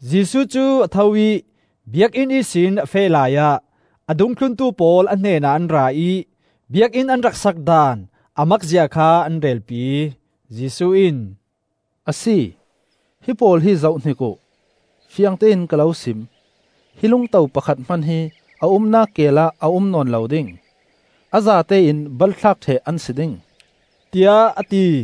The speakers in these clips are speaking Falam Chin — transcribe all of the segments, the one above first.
Jesuh cu a tho ih Biakinn ihsin a feh laiah a dungthluntu pawl a hnenah an ra ih Biakinn an rak sak daan a makzia kha an relpi. Jesuh in, “Asi, hipawl hi zohhnik uh. Fiangtein ka lo sim: hi lungto pakhat hman hi a umnak keel ah a um nawn lo ding; a zate in balthlak ṭheh an si ding,” tiah a ti.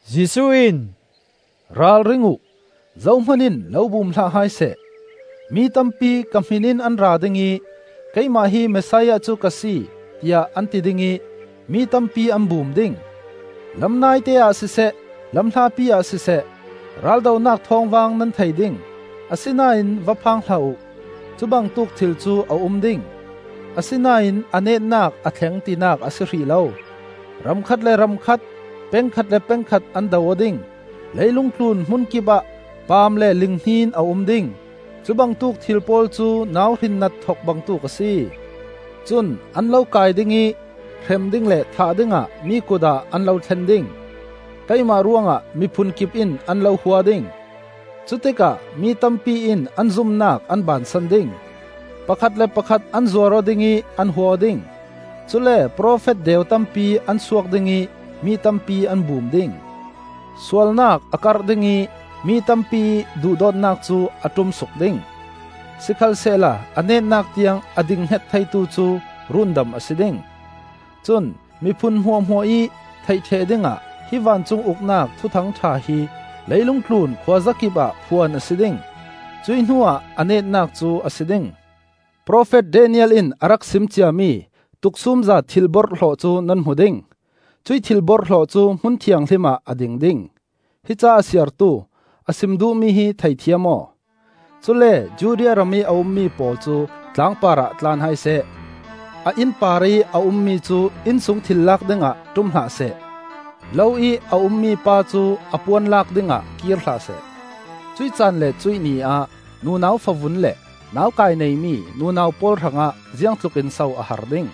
Jesuh in, “Ralring uh, zohman in lo bum hlah hai seh. Mi tampi ka hmin in an ra ding ih, ‘Keimah hi Messiah cu ka si,’ tiah an ti ding ih mi tampi an bum ding. Lam naite ah siseh, lam hlapi ah siseh, raldonak thawmvang nan thei ding, asinain va phang hlah uh. Cubangtuk thil cu a um ding, asinain a netnak a thleng tinak a si hrih lo. Ram khat le ram khat, peng khat le peng khat an do aw ding. Leilung tlun hmun kipah paam le linghnin a um ding. Cubangtuk thil pawl cu nauhrin nat thok bangtuk a si. “Cun an lo kai ding ih hrem ding le thah dingah mi kut ah an lo thlen ding. Keimah ruangah miphun kip in an lo hua ding. Cutikah mi tampi in an zumnak an bansan ding. Pakhat le pakhat an zuar aw ding ih an hua aw ding. Cule profet deu tampi an suak ding ih mi tampi an bum ding. Sualnak a karh ding ih mi tampiih duhdawtnak cu a ṭumsuk ding. Sikhalsehla a netnak tiang a dinghnget theitu cu rundam a si ding. Cun miphun hmuahhmuah ih theih ṭheh dingah hi vancung Uknak Thuthang ṭha hi leilung tlun khuazakip ah phuan a si ding. Cuih hnuah a netnak cu a si ding. “Profet Daniel in a rak sim ciami, ‘Tuksumza Thil-borhhlawh,’ cu nan hmu ding. Cuih Thil-borhhlawh cu hmun thianghlim ah a ding ding. (Hi ca a siartu: a sim duhmi hi theithiam aw.) Cule Judea ramih a ummi pawl cu tlangpar ah tlan hai seh. A inn parih a ummi cu innsung thilri lak dingah ṭum hlah seh. Lo ih a ummi pa cu a puan lak dingah kir hlah seh. Cuih caan le cuih ni ah nunau favun le naukai neimi nunau pawl hrangah ziangtlukin so a har ding.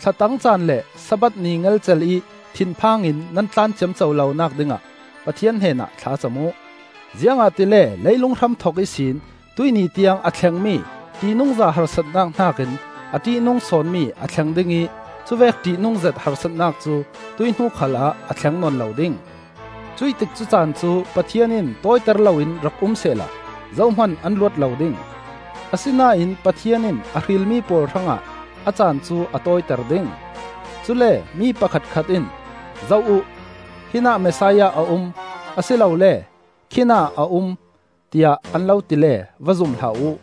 Thlatang caan le Sabbath ni ngelcel ih thinphang in nan tlan ciamco lonak dingah Pathian hnenah thlacam uh! Ziangahtile leilung hramthok ihsin tuih ni tiang a thlengmi ṭihnungza harsatnak hnakin a ṭihnung sawnmi a thleng ding ih cuvek ṭihnungzet harsatnak cu tuih hnu khalah a thleng nawn lo ding. Cuih tikcu caan cu Pathian in tawiter loin rak um sehla zohman an luat lo ding. Asinain Pathian in a hrilmi pawl hrangah a caan cu a tawiter ding. “Cule mi pakhatkhat in, ‘Zoh uh, hinah Messiah a um,’ a si lole ‘Khinah a um,’ tiah an lo ti le va zum hlah uh.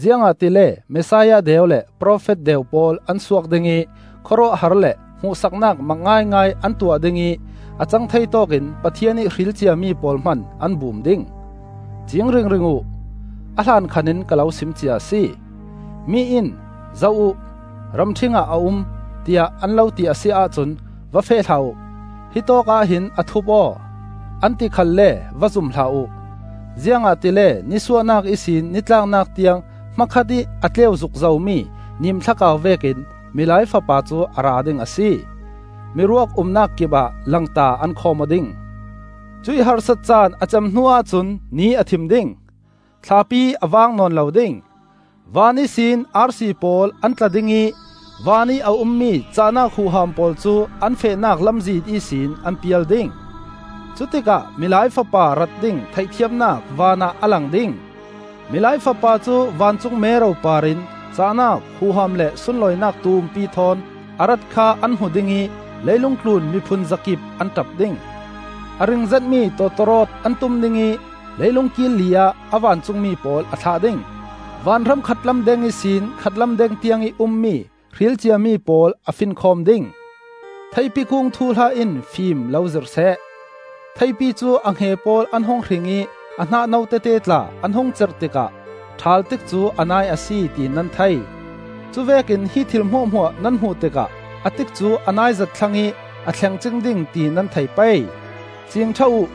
Ziangahtile Messiah deu le profet deu pawl an suak ding ih khawruahhar le hmuhsaknak mak ngaingai an tuah ding ih a cang thei tawkin Pathian ih hrilciami pawl hman an bum ding. Ciing ringring uh! A hlankhan in ka lo simcia a si. “Mi in, ‘Zoh uh, ramṭhing ah a um,’ tiah an lo ti a si ahcun va feh hlah uh. ‘Hi tawkah hin a thup aw,’ an ti khalle va zum hlah uh. Ziangahtile nisuahnak ihsin ni tlaknak tiang hmakhat ih a tleu zukzomi nimthlakau vekin Milai Fapa cu a ra ding a si. “Miruak umnak kipah langta an khawm aw ding. “Cuih harsat caan a cem hnuah cun ni a thim ding, thlapi a vang nawn lo ding, van ihsin arsi pawl an tla ding ih vanih a ummi cah-nak huham pawl cu an fehnak lamzin ihsin an pial ding. Cutikah Milai Fapa rat ding theihthiamnak van ah a lang ding; Milai Fapa cu vancung mero parin cah-nak huham le sunlawinak tumpi thawn a rat kha an hmu ding ih leilung tlun miphun zakip an ṭap ding. A ringzetmi tawtawrawt an tum ding ih leilung kil li ah a vancungmi pawl a thlah ding; vanhram khatlam deng ihsin khatlam deng tiangih ummi hrilciami pawl a finkhawm ding. “Theipi kung thuhla in fim lo zirhseh. Theipi cu a hnge pawl an hung hring ih a hnah no tete tla an hung cerh tikah ṭhal tikcu a nai a si ti nan thei. Cuvekin hi thil hmuahhmuah nan hmuh tikah a tikcu a naizet thlang ih a thleng cing ding ti nan thei pei. Ciing ṭha uh: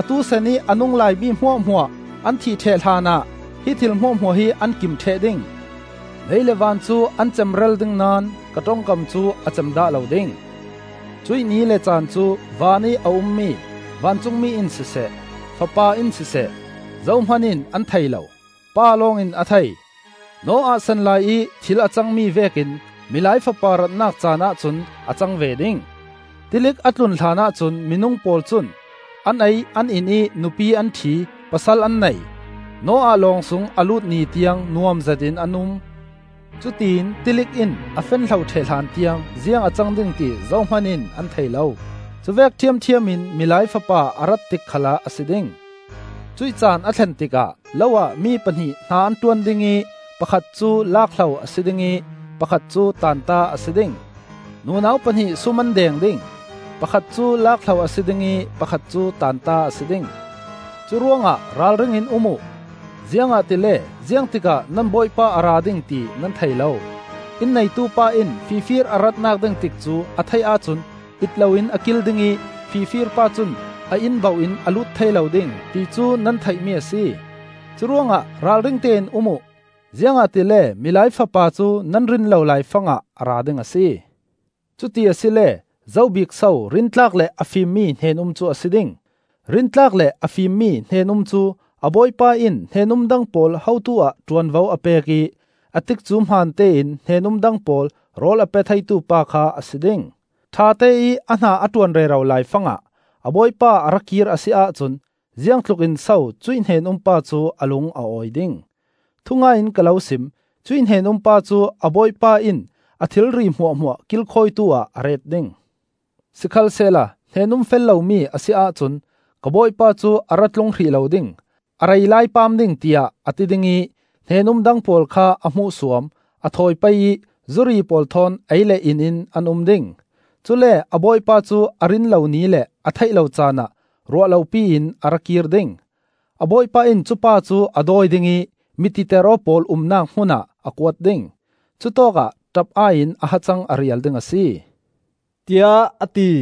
atu sanih a nunglai mi hmuahhmuah an thih ṭheh hlanah hi thil hmuahhmuah hi an kim ṭheh ding. Lei le van cu an cemral ding naón ka ṭongkam cu a cem dah lo ding. “Cuih ni le caan cu vanih a um mi vancungmi in siseh, Fapa in siseh, zohman in an thei lo; Pa lawng in a thei. Noah san laiih thil a cangmi vekin Milai Fapa ratnak caanah cun a cang ve ding. Tilik a tlun hlanah cun minung pawl cun an ei an in ih nupi an ṭhi, pasal an nei; Noah lawng sung a lut ni tiang nuam zetin an um. Cutiin tilik in a fen hlo ṭheh hlan tiang ziang a cang ding ti zohman in an thei lo. Cuvek ṭhiamṭhiam in Milai Fapa a rat tik khalah a si ding. Cuih caan a thlen tikah lo ah mi pahnih hna an ṭuan ding ih pakhat cu lakhlo a si ding ih pakhat cu taanta a si ding. Nunau pahnih sum an deng ding; pakhat cu lakhlo a si ding ih pakhat cu taanta a si ding. “Curuangah ralring in um uh; ziangahtile ziang tikah nan Bawipa a ra ding ti nan thei lo. Inn neitu pa in fifir a ratnak ding tikcu a theih ahcun it loin a kil ding ih fifir pa cun a inn bauh in a lut thei lo ding, ti cu nan theihmi a si. Curuangah ralring tein um uh, ziangahtile Milai Fapa cu nan rin lo laifangah a ra ding a si. “Cuti asile zo bik so rintlak le a fimmi hnen-um cu a si ding? Rintlak le a fimmi hnen-um cu a bawipa in hnen-um dang pawl hotu ah ṭuanvo a pek ih a tikcu hmantein hnen-um dang pawl rawl a pe theitu pa kha a si ding. Ṭhateih a hna a ṭuan rero laifangah a bawipa a ra kir a si ahcun ziangtluk in so cuih hnen-um pa cu a lung a awi ding? Thungai in ka lo sim: cuih hnen-um pa cu a bawipa in a thilri hmuahhmuah kilkhawitu ah a ret ding. Sikhalsehla hnen-um fel lomi a si ahcun, ka bawipa cu a ra tlung hrih lo ding, a rei lai paam ding tiah a ti ding ih hnen-um dang pawl kha a hmuhsuam, a thawi pei ih zuri pawl thawn ei le in in an um ding. Cule a bawipa cu a rin lo ni le a theih lo caanah ruah lopi in a ra kir ding. A bawipa in cupa cu a dawi ding ih mititeraw pawl umnak hmunah a kuat ding; cutawkah ṭap-ai in a hacang a rial ding a si,” tiah a ti.